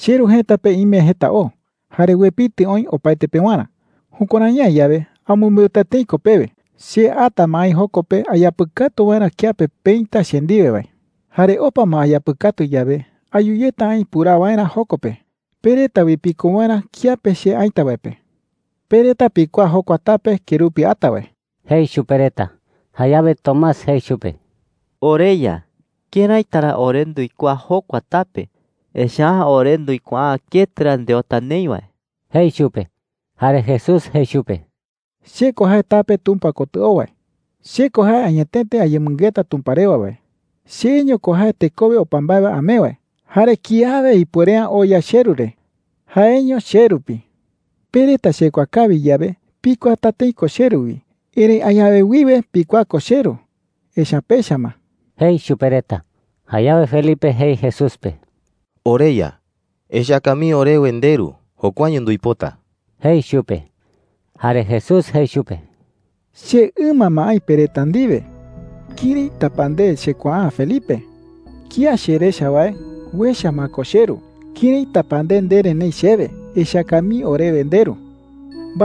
“CheRu jëta pe ime jeta o, jare uepitɨ oï opaete pewarä. Jukuärai’ä yawe, amɨmbeuta tëi ko pewe. Che ata ma aï joko pe ayapɨkatu waerä kiape peïta che ndiwe wae. Jare opa ma ayapɨkatu yawe, ayu yeta aï puraa waerä joko pe, pe reta wi piko waerä kiape che aïta wae pe. Pe reta pikuaa jokua tape kerupi ata wae,” jei chupe reta. Jayawe Tomás jei chupe: “OreYa, ¿këraita ra ore nduikuaa jokua tape? Echa’ä ore nduikuaa’ä ketɨ ra ndeota neï wae,” jei chupe. Jare Jesús jei chupe: “Che ko jae tape Tumpa kotɨ oo wae. Che ko jae añetete ayemɨngeta Tumpa rewa wae. Cheño ko jae tekowe opa mbae wae amee wae. Jare kiawe ipuere’ä oya cheRu re – jaeño che rupi,” jei chupe. “Pe reta chekuaa kawi yawe, pikuaata tëi ko cheRu wi. Erëi añawe wiwe pikuaa ko cheRu, echa’ä pecha ma,” jei chupe reta. Jayawe Felipe jei Jesús pe: “OreYa, echaka mii orewe ndeRu. Jokuaño nduipota,” jei chupe. Jare Jesús jei chupe: “Che ɨma ma aï pe reta ndiwe. ¿Këraita pa nde chekuaa’ä, Felipe?” jei chupe. “Kía cherecha wae, uecha ma ko cheRu. ¿Këraita pa nde ndere neï chewe, ‘Echaka mii orewe ndeRu’?” jei chupe.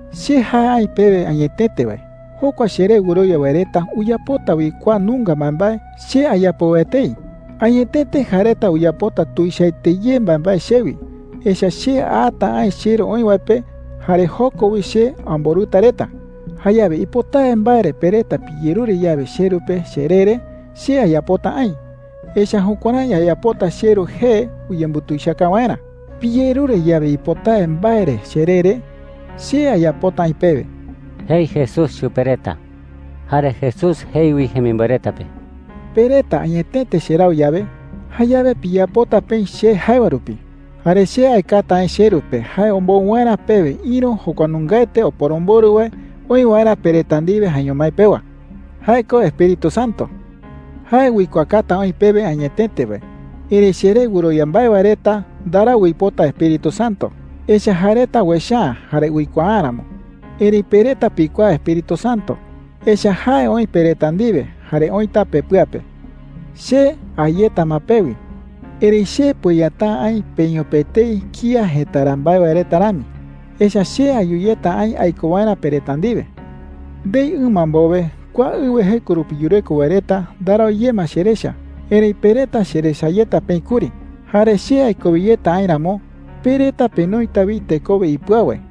“Che jae aï pewe añetete wae, jokua cheré wɨrowia wae reta uyapota wi kua nunga mbaembae che ayapo wae etei. Añetete jae reta uyapota tuichaete ye mbaembae chewi, echa’ä che ata aï cheRu oï wae pe jare joko wi che amborɨta reta,” jei chupe reta. “Jayawe ipotawe mbae re pe reta piyerure yawe cheRu pe cheree re, che ayapota aï. Echa’ä jukuärái ayapota cheRu jee uyembutuichaka waerä. Piyerure yawe ipotawe mbae re cheree re, che ayapota aï pewe,” jei Jesús chupe reta. Jare Jesús jei wi jemimboe reta pe: “Pe reta añetete cherau yawe, jayawe piyapota peï che jae wae rupi. Jare che aekata aï cheRu pe jae ombou waerä pewe ïru jokua nungaete Oporomborɨ wae oï waerä pe reta ndiwe jaeño mái pewa. Jae ko Espíritu Santo,” jei. “Jae uikuaakata oï pewe añetete wae. Erëi cheré wɨrowia mbae wae reta ndarau uipota Espíritu Santo, echa’ä jae reta uecha’ä jare uikuaa’ä ramo. Erëi pe reta pikuaa Espíritu Santo, echa’ä jae oï pe reta ndiwe jare oïta pepɨa pe,” jei chupe reta. “Che a yeta ma pewi, erëi che pueyata’ä aï peño pe etei kía jëtara mbae wae reta rami. Echa’ä che ayu yeta aï aiko waerä pe reta ndiwe,” jei chupe reta. “Ndei ɨma mbowe, kua ɨwɨ jeko rupi yureko wae reta ndarau ye ma cherecha. Erëi pe reta cherecha yeta peï kuri. Jare che aikowe yeta aï ramo, pe reta penoita wi tekowe ipɨau wae.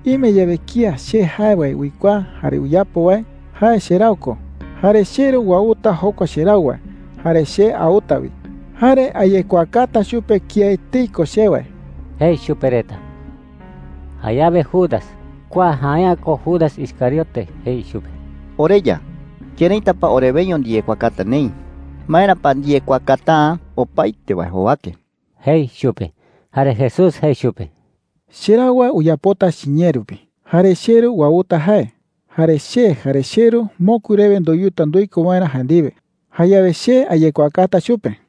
“Ime yawe kía che jae wae uikuaa jare uyapo wae, jae cherau ko. Jare cheRu uauta jokua cherau wae, jare che auta wi. Jare ayekuaakata chupe kía etei ko che wae,” jei chupe reta. Jayawe Judas (kua jae’ä ko Judas Iscariote) jei chupe: “OreYa, ¿këraita pa oreweño ndiyekuaakata neï? ¿Maera pa ndiyekuaakata’ä opaete wae jowake?” jei chupe. Jare Jesús jei chupe: “Cherau wae uyapota chiñee rupi. Jare cheRu uauta jae. Jare che jare cheRu mokui rewe ndoyuta nduiko waerä jae ndiwe. Jayawe che ayekuaakata chupe,” jei.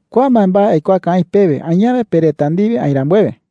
“Kua mbaembae aikuaaka aï pewe añawe pe reta ndiwe aï rambuewe,” jei.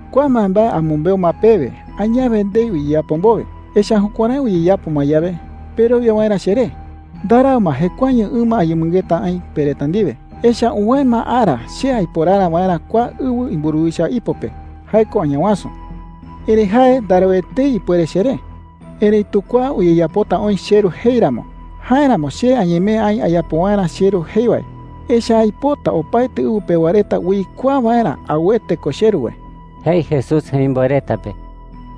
“Kua mbaembae amɨmbeu ma pewe añawe ndei uyeyapo mbowe. Echa’ä jukuärái uyeyapo ma yawe, perowia waerä cheré,” jei chupe reta. “Ndarau ma jekuaeño ɨma ayemɨngeta aï pe reta ndiwe. Echa’ä uwäe ma ara che aiporara waerä kua ɨwɨ imburuwicha ipo pe – jae ko Añawasu. Erëi jae ndarau etei ipuere cheré,” jei chupe reta. “Erëitu kua uyeyapota oï cheRu jei ramo. Jáeramo che añemee aï ayapo waerä cheRu jei wae, echa’ä aipota opaete ɨwɨ pewa reta uikuaa waerä auete ko cheRu wae,” jei Jesús jemimboe reta pe.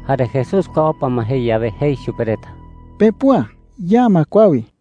Jare Jesús kua opa ma jei yawe, jei chupe reta: “Pepüa. Ya ma kua wi.”